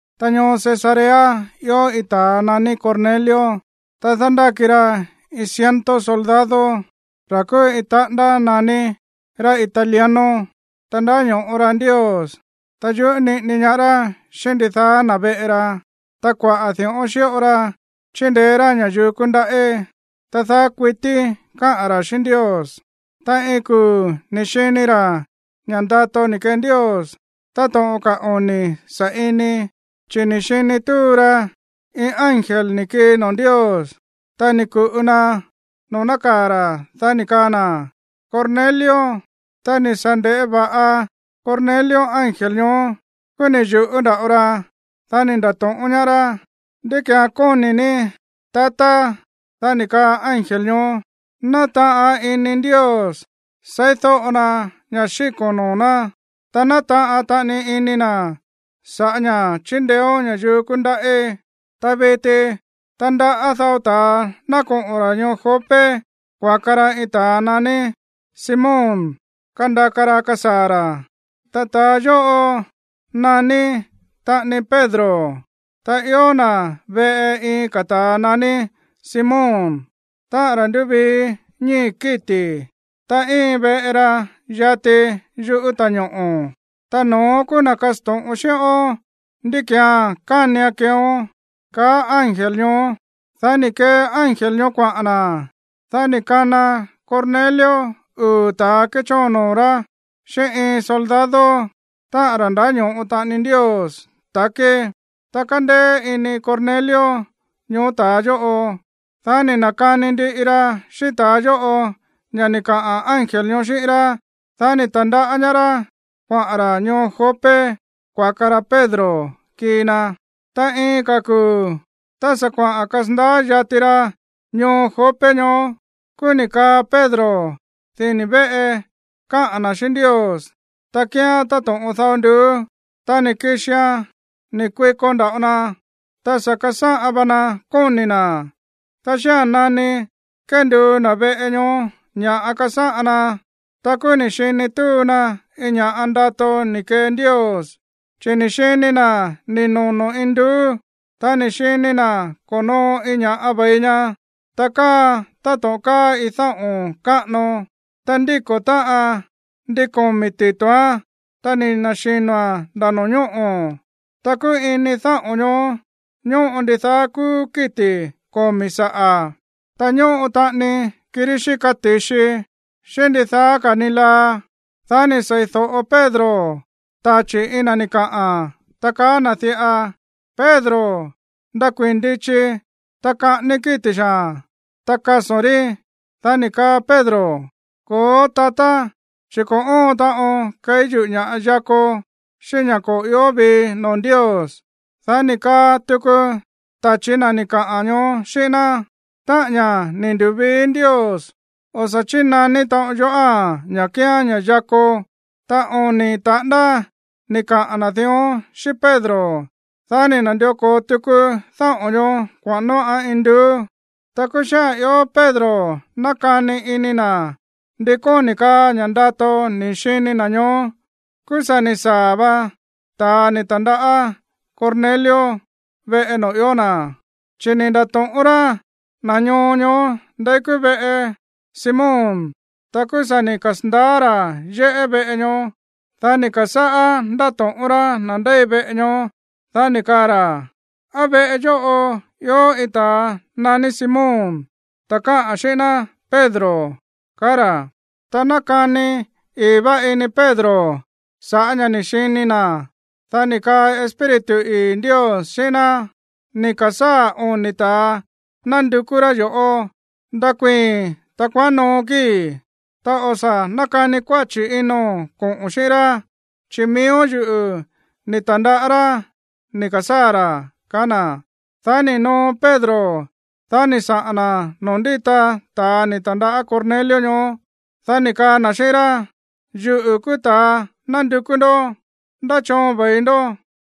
Ta ñoo Cesarea ió iin ta̱a naní Cornelio. Ta dándáki ra iin ciento soldado, ra̱ kúú iin taꞌándá naní, ra̱ Italiano. Ta ndáño̱ꞌo ra Ndios, ta yuꞌú niꞌini ñaá rá xíꞌín ndidaá na̱ veꞌe ra. Ta kuaꞌa̱ di̱ꞌón xíꞌo ra chíndeé rá ña̱yuu kúndaꞌí. Ta daá kuití káꞌa̱n ra̱ xíꞌín Ndios. Ta iin kuu̱ ni̱ xini ra̱ ña̱ꞌa ndato ni̱ kee Ndios táto̱ꞌon ka̱ oni̱ sa̱ꞌini, chi̱ ni̱ xini túu ra iin ángel ni̱ kii noo̱ Ndios. Ta ni̱ ku̱ꞌu na noo̱ nákaa̱ ra̱. Dá ni̱ kaa na̱: ―¡Cornelio! Tá ni̱ sa̱ nde̱ꞌé va̱ꞌa Cornelio ángel ñoó, kúú ni̱ yu̱ꞌú nda̱ꞌo ra. Dá ni̱ nda̱to̱ꞌón ñaá rá: ―¿Ndí ki̱án kóni̱ ní, tatá? Dá ni̱ kaa ángel ñoó: ―Nátaꞌan ini Ndios seídóꞌo na ña̱ xíko̱n noo̱ ná, ta nátaꞌan taꞌani ini na̱ sa̱ꞌá ña̱ chíndeéón ña̱yuu kúndaꞌí. Ta viti tandaꞌá dao ta̱a ná koꞌo̱n ra̱ ñoo Jope kuaka ra iin ta̱a naní Simón kandaka ra kasaa̱ ra̱. Ta ta̱ yóꞌo naní taꞌani Pedro. Ta ió na̱ veꞌe iin ka̱ ta̱a naní Simón, táꞌa̱n ra̱ ndúvii ñíi̱ kíti̱. Ta íin veꞌe ra yati yuꞌú ta̱ñoꞌo̱. Ta no̱ón kúú na̱ kasto̱ꞌon xíꞌón ndí ki̱án kánian keeón ―kaá ángel ñoó. Dá ni̱ kee ángel ñoó kuaꞌa̱n na̱. Dá ni̱ kana Cornelio uu̱ ta̱a kéchóon noo̱ rá xíꞌín iin soldado, táꞌa̱n ra̱ ndáño̱ꞌo taꞌani Ndios takí. Ta kándéé ini Cornelio ñoó ta̱a yóꞌo. Dá ni̱ na̱kani ndiꞌi ra xíꞌín ta̱a yóꞌo ña̱ ni̱ kaꞌa̱n ángel ñoó xíꞌín rá. Dá ni̱ ta̱ndaꞌá ñaá rá kuaꞌa̱n ra̱ ñoo Jope kuaka ra Pedro kii na. Ta iin ka̱ kuu̱, tá sa̱ kuaꞌa̱n kasandaá yati ra ñoo Jope ñoó, kúú ni̱ kaa Pedro dini̱ véꞌe kaꞌa̱n na̱ xíꞌín Ndios, ta kíán táto̱ꞌon dao nduú. Ta ni̱ kixian ni̱ kuiko nda̱ꞌo na. Ta sa̱ kasáꞌan va na kóni̱ na̱. Ta xía̱n nani kénduu na̱ veꞌe ñoó ña̱ꞌa kasáꞌan na, ta kúú ni̱ xini túu na iin ña̱ꞌa ndato ni̱ kee Ndios. Chi̱ ni̱ xini na̱ ni̱ nono̱ induú. Ta ni̱ xini na̱ ko̱noo iin ña̱ꞌa ve̱i ña̱, ta káaan táto̱ꞌon káa iin dáꞌo̱n káꞌano. Ta ndíko̱ táꞌan ndin komi̱ tito̱án. Ta ni̱ na̱xino̱a̱n nda̱ no̱ñóꞌo̱. Ta kúú ini dáꞌo̱n ñoó ñóꞌo ndidaá kúú kíti̱ komi̱ saꞌa̱, ta ñóꞌo taꞌani kirí xíka ti̱xi, xíꞌín ndidaá ka̱ ni laa. Dá ni̱ sei̱do̱ꞌo Pedro tachi̱ iin na̱ ni̱ kaꞌa̱n, ta kaá na̱ diꞌa: ―Pedro, nakuii̱n ndichi. Ta kaꞌání kíti̱ xaa̱n, ta kaso̱n rí. Dá ni̱ kaa Pedro: ―Ko̱ó, tatá, chi̱ ko̱ óon taꞌon keí yuꞌu̱ ña̱ꞌa yako xíꞌín ña̱ ko̱ ió vii noo̱ Ndios. Dá ni̱ kaa tuku tachi̱ na̱ ni̱ kaꞌa̱n ñoó xíꞌín ná: ―Táꞌa̱n ña̱ ni̱ ndu̱vii Ndios, o̱ sa̱ chínaní taꞌon yoꞌáa̱n ña̱ kía̱n ña̱ yako. Ta oni̱ taꞌándá ni̱ kaꞌa̱n na̱ dión xíꞌín Pedro. Dá ni̱ na̱ndió ko̱o tuku dáꞌo̱n ñoó kuaꞌa̱n nóꞌa̱n induú. Ta kúú xía̱n ió Pedro nákani ini na̱ ndi kóni̱ kaa ña̱ ndato ni̱ xini na̱ ñoó, kúú sa̱ ni̱ saa̱ va ta̱a ni̱ ta̱ndaꞌá Cornelio veꞌe noo̱ ió na̱, chi̱ ni̱ nda̱to̱ꞌón rá na̱ ñoo ñoó ndeí kúú veꞌe Simón. Ta kúú sa̱ ni̱ kasa̱ndaá ra̱ yéꞌé veꞌe ñoó. Dá ni̱ ka̱sáꞌá ndáto̱ꞌón rá na̱ ndéi veꞌe ñoó, dá ni̱ kaa ra̱: ―¿Á veꞌe yóꞌo ió iin ta̱a naní Simón, ta̱a káꞌa̱n xíꞌín ná Pedro? ―kaá ra̱. Ta nákani ii̱ vá ini Pedro sa̱ꞌá ña̱ ni̱ xini na̱, dá ni̱ kaa Espíritu ii̱ Ndios xíꞌín ná: ―Ni̱ ka̱sáa̱ oni̱ ta̱a nándukú rá yo̱ꞌó. Ndakuii̱n, ta kuaꞌán noo kíi̱, ta o̱ sa̱ nákani kuáchi̱ ino̱n koꞌo̱n xíꞌín rá, chi̱ miíó yuꞌu̱ ni̱ ta̱ndaꞌá rá ni̱ ka̱sáa̱ ra̱ ―kaá na̱. Dá ni̱ noo Pedro, dá ni̱ saꞌa̱n na̱ noo̱ ndíta ta̱a ni̱ ta̱ndaꞌá Cornelio ñoó. Dá ni̱ kaa na̱ xíꞌín rá: ―Yuꞌu̱ kúú ta̱a nándukú ndoꞌó. ¿Ndá choon ve̱i ndó?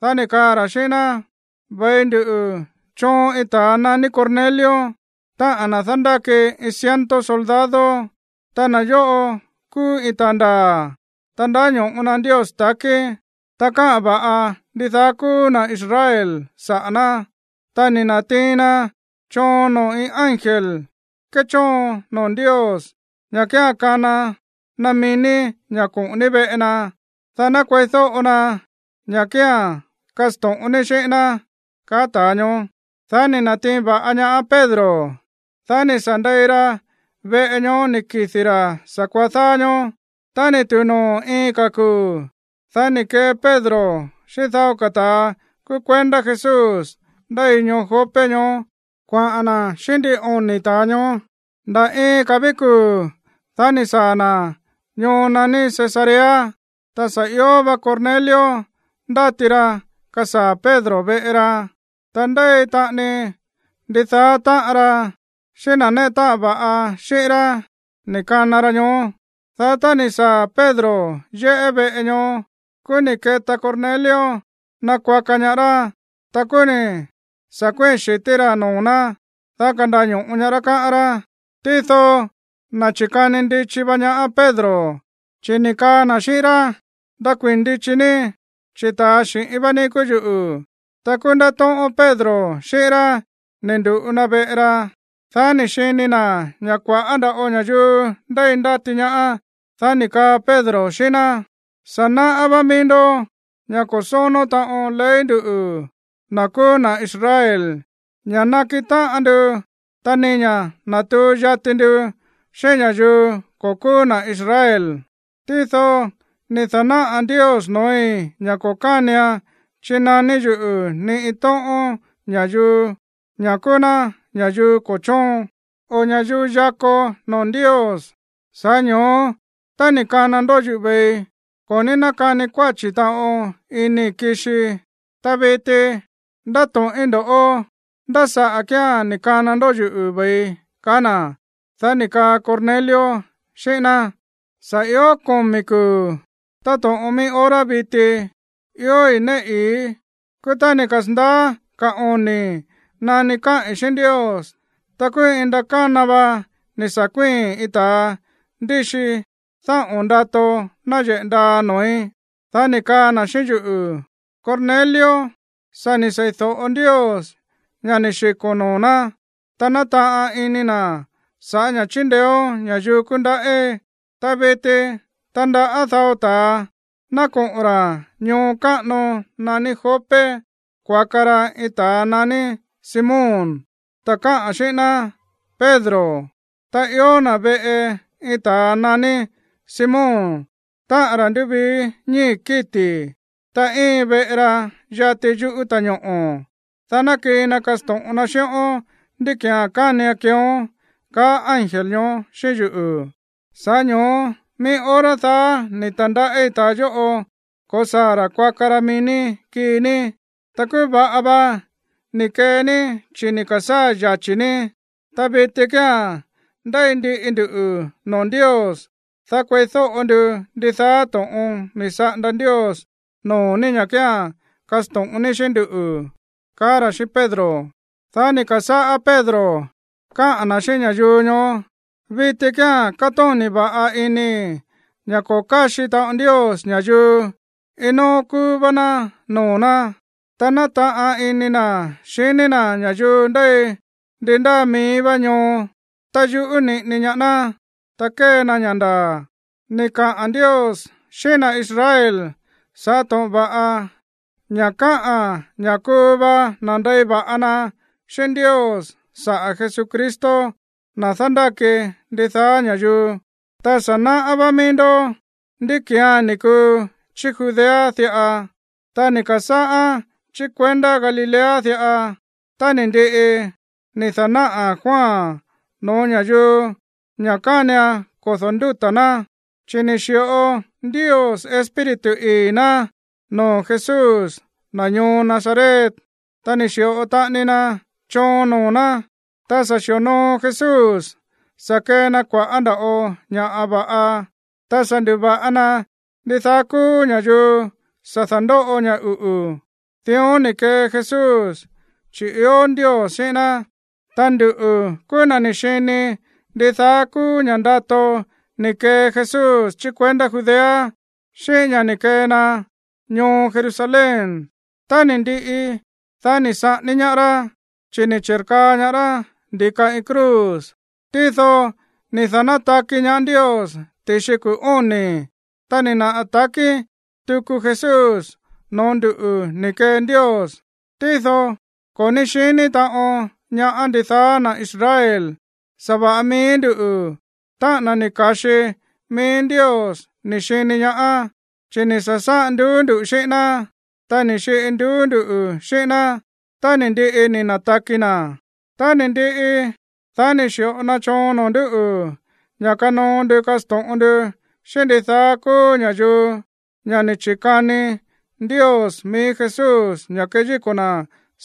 Dá ni̱ kaa ra̱ xíꞌín ná: ―Ve̱i ndu choon iin ta̱a naní Cornelio, táꞌa̱n na̱ dándáki iin ciento soldado. Ta na̱ yóꞌo kúú iin ta̱a ndaa̱, ta ndáño̱ꞌo na Ndios takí. Ta káꞌa̱n va̱ꞌa ndidaá kúú na̱ Israel saꞌa̱ ná. Ta ni̱ na̱tiin na choon noo̱ iin ángel kéchóon noo̱ Ndios ña̱ kía̱n kana na mií ní ña̱ koꞌo̱n ní veꞌe na, dá ná kueídóꞌo na ña̱ kía̱n kasto̱ꞌon ní xíꞌín ná ―kaá ta̱a ñoó. Dá ni̱ na̱tiin va̱ꞌa ñaá Pedro. Dá ni̱ sa̱ ndei ra veꞌe ñoó ni̱ kidi̱ ra̱ sa̱kuaá dáá ñóó. Tá ni̱ tu̱u noo̱ iin ka̱ kuu̱, dá ni̱ kee Pedro xíꞌín dao ka̱ ta̱a kúú kuendá Jesús ndéi ñoo Jope ñoó kuaꞌa̱n na̱ xíꞌín ndin oni̱ ta̱a ñoó. Nda̱ iin ka̱ ví kuu̱, dá ni̱ saa̱ na̱ ñoo naní Cesarea. Ta sa̱ io va Cornelio ndáti ra kasaa̱ Pedro veꞌe ra. Ta ndéi taꞌani ndidaá táꞌan ra, xíꞌín na̱ néꞌe táꞌan va̱ꞌa xíꞌín rá ni̱ kana ra ñoó. Dá tá ni̱ saa̱ Pedro yéꞌé veꞌe ñoó, kúú ni̱ keta Cornelio nakuaka ñaá rá. Ta kúú ni̱ sa̱ kuíi̱n xi̱tí rá noo̱ ná, dá kandaño̱ꞌo ñaá rá, káꞌán rá. Tído ni̱ na̱chi̱kani ndichi va ñaá Pedro, chi̱ ni̱ kaa na̱ xíꞌín rá: ―Ndakuii̱n ndichi ní, chi̱ ta̱a xi̱ꞌín vá ní kúú yuꞌu̱. Ta kúú ndátóꞌón Pedro xíꞌín rá ni̱ ndu̱ꞌu na veꞌe ra. Dá ni̱ xini na̱ ña̱ kua̱ꞌá nda̱ꞌo ña̱yuu ndéi ndáti ñaá. Dá ni̱ kaa Pedro xíꞌín ná: ―Sa̱ náꞌá vá mií ndó ña̱ ko̱ sónó taꞌon ley nduꞌu̱, na̱ kúú na̱ Israel, ña̱ nakiꞌin táꞌan ndu ta ni ña̱ natuu yati ndu xíꞌín ña̱yuu ko̱ kúú na̱ Israel. Tído ni̱ da̱náꞌa̱ Ndios noo̱í ña̱ ko̱ kánian chinaní yuꞌu̱ ni iin tóꞌón ña̱yuu ña̱ kúú ná ña̱yuu ko̱ chóon, o ña̱yuu yako noo̱ Ndios. Sa̱ꞌá ño̱ó, tá ni̱ kana ndó yuꞌu̱ ve̱i, ko̱ ní nákani kuáchi̱ taꞌon inii̱ kixii. Ta viti ndáto̱ꞌín ndoꞌó, ¿ndá saꞌa̱ kíán ni̱ kana ndó yuꞌu̱ ve̱ii? ―kaá na̱. Dá ni̱ kaa Cornelio xíꞌín ná: ―Sa̱ io komi̱ kuu̱, táto̱ꞌon mií hora viti, iói̱ néꞌe ii̱í. Kúú tá ni̱ kasa̱ndaá ka̱ oni̱ nani káꞌi̱n xíꞌín Ndios, ta kúú iin ndakána vá ni̱ sa̱ kuíi̱n iin ta̱a ndíxi dáꞌo̱n ndato náyeꞌe̱ ndaa noo̱í. Dá ni̱ kaa na̱ xíꞌín yuꞌu̱: “Cornelio, sa̱ ni̱ sei̱do̱ꞌo Ndios ña̱ ni̱ xiko̱n noo̱ ná, ta nátaꞌan ini na̱ sa̱ꞌá ña̱ chíndeéón ña̱yuu kúndaꞌí. Ta viti tandaꞌá dao ta̱a ná koꞌo̱n ra̱ ñoo káꞌano naní Jope kuaka ra iin ta̱a naní Simón, ta̱ káꞌa̱n xíꞌín ná Pedro. Ta ió na̱ veꞌe iin ta̱a naní Simón, táꞌa̱n ra̱ ndúvii ñíi̱ kíti̱. Ta íin veꞌe ra yati yuꞌú ta̱ñoꞌo̱. Dá ná kii na kasto̱ꞌon na xíꞌón ndí ki̱án kánian keeón”, kaá ángel ñoó xíꞌín yuꞌu̱. Sa̱ꞌá ño̱ó mií hora daá ni̱ ta̱ndaꞌí ta̱a yóꞌo ko̱saa̱ ra̱ kuaka ra mií kii ní. Ta kúú va̱ꞌa va ni̱ kee ní chi̱ ni̱ ka̱sáa̱ yachi̱ ní. Ta viti kía̱n ndéi ndiꞌi nduꞌu̱ noo̱ Ndios, dá kueídóꞌo ndu ndidaá to̱ꞌon ni̱ saꞌanda Ndios noo̱ ní ña̱ kía̱n kasto̱ꞌon ní xíꞌín nduꞌu̱ ―kaá ra̱ xíꞌín Pedro. Dá ni̱ ka̱sáꞌá Pedro káꞌa̱n na̱ xíꞌín ña̱yuu ñoó: ―Viti kía̱n kátóni̱ va̱ꞌa inii̱ ña̱ ko̱ káxi taꞌon Ndios ña̱yuu, iin nóó kúú vá ná noo̱ ná. Ta nátaꞌan ini na̱ xiní na̱ ña̱yuu ndéi ndi ndáa mií vá ñoo tá yuꞌú niꞌini ñaá ná, ta kée na ña̱ ndaa̱. Ni̱ kaꞌa̱n Ndios xíꞌín na̱ Israel sa̱ꞌá to̱ꞌon va̱ꞌa ña̱ káꞌa̱n ña̱ kuu va nandei va̱ꞌa na xíꞌín Ndios saꞌa̱ Jesucristo, na̱ dándáki ndidaá ña̱yuu. Ta sa̱ náꞌá vá mií ndó ndí ki̱án ni̱ kuu chí Judea diꞌa. Ta ni̱ ka̱sáꞌán chí kuendá Galilea diꞌa tá ni̱ ndiꞌi ni̱ da̱náꞌa̱ Juan no̱ó ña̱yuu ña̱ kánian kodo̱ ndúta̱ ná. Chi̱ ni̱ xi̱ꞌo Ndios Espíritu ii̱ ná noo̱ Jesús, na̱ ñoo Nazaret, ta ni̱ xi̱ꞌo taꞌani na choon noo̱ ná. Ta sa̱ xi̱onoo Jesús sa̱ kee na kua̱ꞌá nda̱ꞌo ña̱ va̱ꞌa, ta sa̱ ndu̱va̱ꞌa na ndidaá kúú ña̱yuu sa̱ da̱ndóꞌo ña̱ uꞌu̱. Dión ni̱ kee Jesús, chi̱ ió Ndios xíꞌín ná. Ta nduꞌu̱ kúú na̱ ni̱ xini ndidaá kúú ña̱ꞌa ndato ni̱ kee Jesús chí kuendá Judea, xíꞌín ña̱ ni̱ kee na ñoo Jerusalén. Tá ni̱ ndiꞌi, dá ni̱ saꞌání ñaá rá, chi̱ ni̱ chi̱rkaa ñaá rá ndi̱ka iin cruz. Tído ni̱ da̱nátaki ñaá Ndios ti̱xi kuu̱ óni̱. Ta ni̱ naꞌa̱ takí tuku Jesús noo̱ ndúꞌu̱ ni̱ kee Ndios. Tído ko̱ ní xiní taꞌon ñaá ndidaá na̱ Israel. Sa̱va̱ꞌa mií nduꞌu̱, táꞌa̱n na̱ ni̱ ka̱xi mií Ndios, ni̱ xini ñaá, chi̱ ni̱ sa̱sáꞌan nduú ndu̱ xíꞌín ná, ta ni̱ xiꞌi nduú nduꞌu̱ xíꞌín ná tá ni̱ ndiꞌi ni̱ na̱taki na̱. Tá ni̱ ndiꞌi, dá ni̱ xi̱ꞌo na choon noo̱ ndúꞌu̱ ña̱ kanoo ndu kasto̱ꞌon ndu xíꞌín ndidaá kúú ña̱yuu ña̱ ni̱ chi̱kani Ndios mií Jesús ña̱ keyíko̱ na̱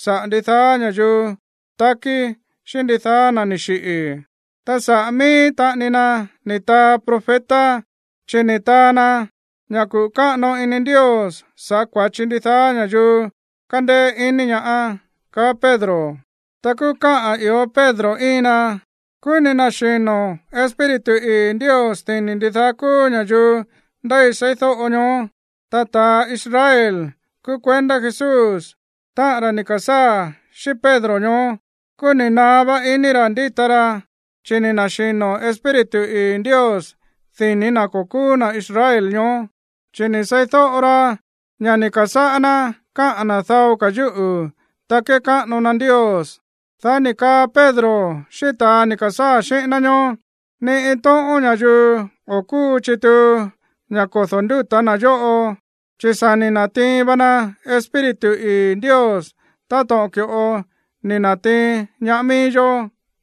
saꞌa̱ ndidaá ña̱yuu takí xíꞌín ndidaá na̱ ni̱ xiꞌi̱. Ta saꞌa̱ mií taꞌani ná ni̱ taa profeta, chi̱ ni̱ taa na ña̱ kuꞌu̱ káꞌano ini Ndios saꞌa̱ kua̱chi ndidaá ña̱yuu kandeé iní ñaá ―kaá Pedro. Ta kúú káꞌa̱n ió Pedro íin na, kúú ni̱ na̱xino̱ Espíritu ii̱ Ndios dini̱ ndidaá kúú ña̱yuu ndéi seídóꞌo ñoó. Ta ta̱ Israel kúú kuendá Jesús, táꞌa̱n ra̱ ni̱ ka̱sáa̱ xíꞌín Pedro ñoó, kúú ni̱ naá vá iní ra̱ ndíta ra, chi̱ ni̱ na̱xino̱ Espíritu ii̱ Ndios dini̱ na̱ ko̱ kúú na̱ Israel ñoó, chi̱ ni̱ seídóꞌo ra ña̱ ni̱ ka̱sáꞌá ná káꞌa̱n na̱ dao ka̱ yúꞌu̱, ta kékáꞌano na Ndios. Dá ni̱ kaa Pedro xíꞌín ta̱a ni̱ ka̱sáa̱ xíꞌín ná ñoó: ―Ni iin tóꞌón ña̱yuu o̱ kúu chituu ña̱ kodo̱ ndúta̱ na̱ yóꞌo, chi̱ sa̱ ni̱ na̱tiin va na Espíritu ii̱ Ndios táto̱ꞌon ki̱ꞌo ni̱ na̱tiin ñaá mií yó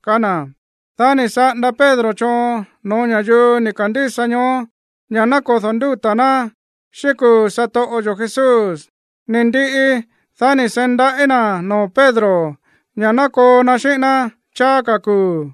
―kaá na̱. Dá ni̱ saꞌanda Pedro choon no̱ó ña̱yuu ni̱ ka̱ndísa ñoó ña̱ ná kodo̱ ndúta̱ ná xíꞌín kuu̱ satoꞌo yo̱ Jesús. Ni ndiꞌi, dá ni̱ seí ndaꞌí na̱ noo̱ Pedro ña̱ ná koo na xíꞌín ná cháá ka̱ kuu̱.